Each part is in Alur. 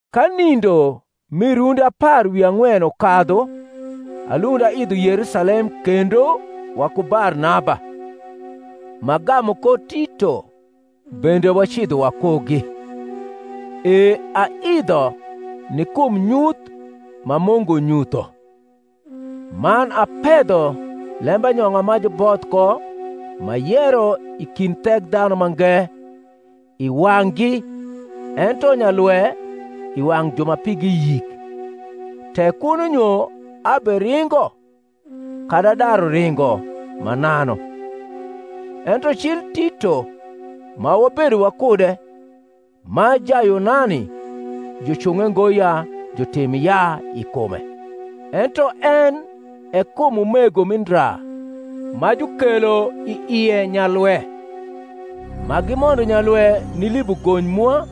Ka nindo mi rundi apar wi ang’wen ukadhu alund aidho Yerusalem kendo waku Barnaba, m’agamu ko Tito bende wacidho wakugi. E aidho ni kum nyuth ma Mungu nyutho; man apedho lembanyong’a ma juboth ko m’ayero i kind Thekdhanumange i wang’gi ento nyalwe i wang’ ju ma pigi yik, tek kuno nyo aberingo, kadi adaru ringo, mananu. Ento cil Tito ma wabedo wakude, ma Jayunani, jucung’e ngo ya jutim yaa i kume: ento en e kum umego mi ndra ma jukelo i ie nyalwe, ma gimondo nyalwe nilibo gony mwa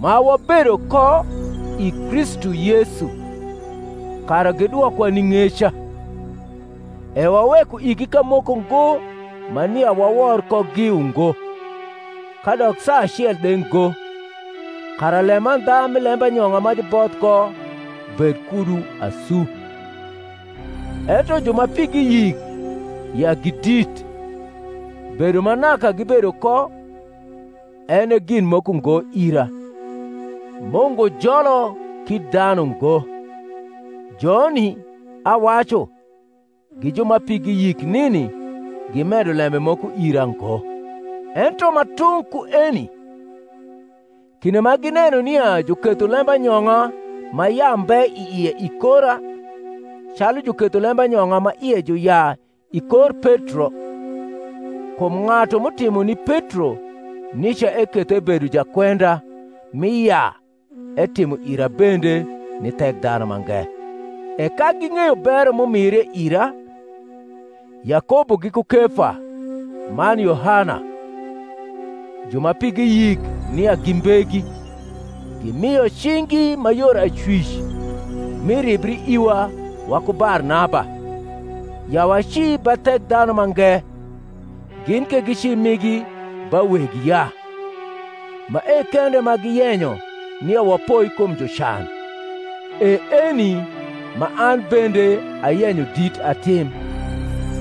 ma wabedo ko i Kristu Yesu, kara gidwokwa ni ng’eca: e waweko igi kamoko ngo ma nia wawor kogi, ungo, kadok saa acel de ngo; kara lemandha mi lembanyong’a ma juboth ko bed kudu asu. Ento ju ma pigi yik ya gi dit (bedo ma naka gibedo ko, en e gin moko ngo ira: Mungu jolo kit dhanu ngo) joni, awacu, gi ju ma pigi yik nini gimedo lembe moko ira ngo: ento ma tung’ ku eni: kinde ma gineno nia juketho lembanyong’a ma yaa mbe i ie i kora, calu juketho lembanyong’a ma ie ju yaa i kor Petro (kum ng’atu m’utimo ni Petro nica eketho ebedo jakwenda mi yaa etimo ira bende ni Thekdhanumange); e ka ging’eyo bero m’umire ira, Yakobo giku Kefa man Yohana, ju ma pigi yik nia gi mbegi, gimio cing’gi ma yor acwic mi ribri iwa waku Barnaba, ya waci ba Thekdhanumange, gin ke gici migi ba weg yaa; mae kende ma giyenyo nia wapoi kum jucan; e eni ma an bende ayenyo dit atim.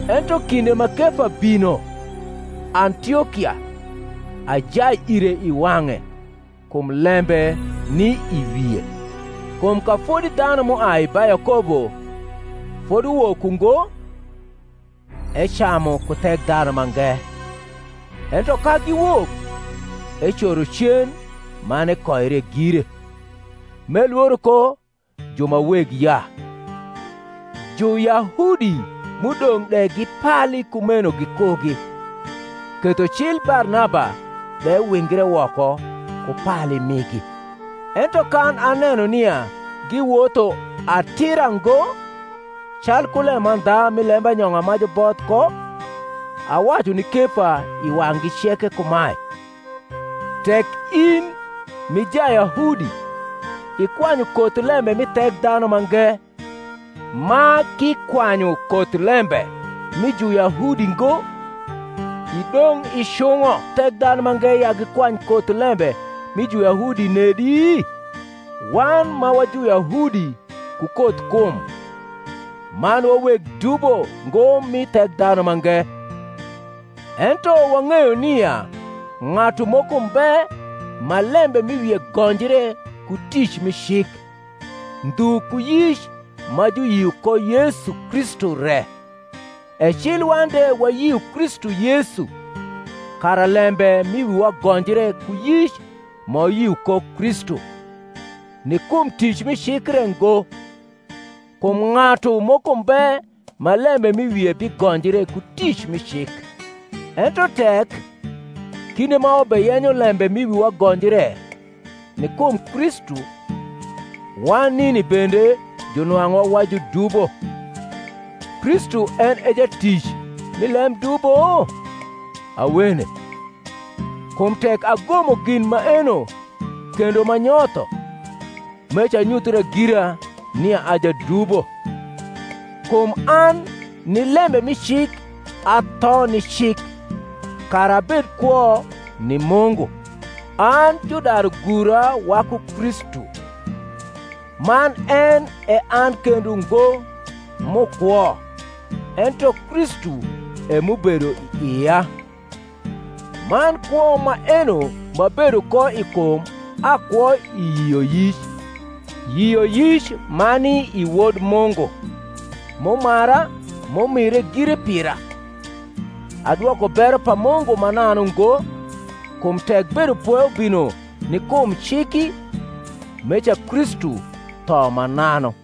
Ento kinde ma Kefa bino Antiokia, ajai ire i wang’e, kum lembe ni i wie. Kum ka fodi dhanu m’uai ba Yakobo foduwok ungo, ecamu ku Thekdhanumange; ento ka giwok, ecoro cen man ekoire gire, m’elworo ko ju ma weg yaa. Juyahudi m’udong’ de gipali kumeno gikugi; ketho cil Barnaba de wingre woko ku pali migi. Ento kan aneno nia giwotho atira ngo calku lemandha mi lembanyong’a ma juboth ko, awacu ni Kefa i wang’gi ceke kumae, Tek in, m’i Jayahudi, ikwanyu koth lembe mi Thekdhanumange, ma k’ikwanyu koth lembe mi Juyahudi ngo, idong’ icung’o Thekdhanumange ya gikwany koth lembe mi Juyahudi nedi? Wan ma wa Juyahudi ku koth kum, man wa weg dubo ngo mi Thekdhanumange, ento wang’eyo nia ng’atu moko mbe ma lembe m’i wie gonjre ku tic mi cik, ndhu ku yic ma juyio ko Yesu Kristu re, e cil wan de wayio Kristu Yesu, kara lembe m’i wiwa gonjre ku yic ma wayio ko Kristu, ni kum tic mi cik re ngo: kum ng’atu moko mbe ma lembe m’i wie bigonjre ku tic mi cik. Ento tek, kinde ma wabeyenyo lembe m’i wiwa gonjre ni kum Kristu, wan nini bende junwang’uwa wa judubo, Kristu en e jatic mi lem dubo? Awene. Kum tek agomo gin maeno kendo m’anyotho, meca anyuthra gira nia a jadubo. Kum an ni lembe mi cik atho ni cik, kara abed kwo ni Mungu. An judaru gura waku Kristu; man en e an kendo ngo m’ukwo ento Kristu e m’ubedo i ia; man kwo maeno m’abedo ko i kum akwo i yioyic, yioyic ma ni i Wod Mungu, m’umara, m’umire gire pira. Adwoko bero pa Mungu mananu ngo: kum tek bedopwe ubino ni kum ciki, meca Kristu tho mananu.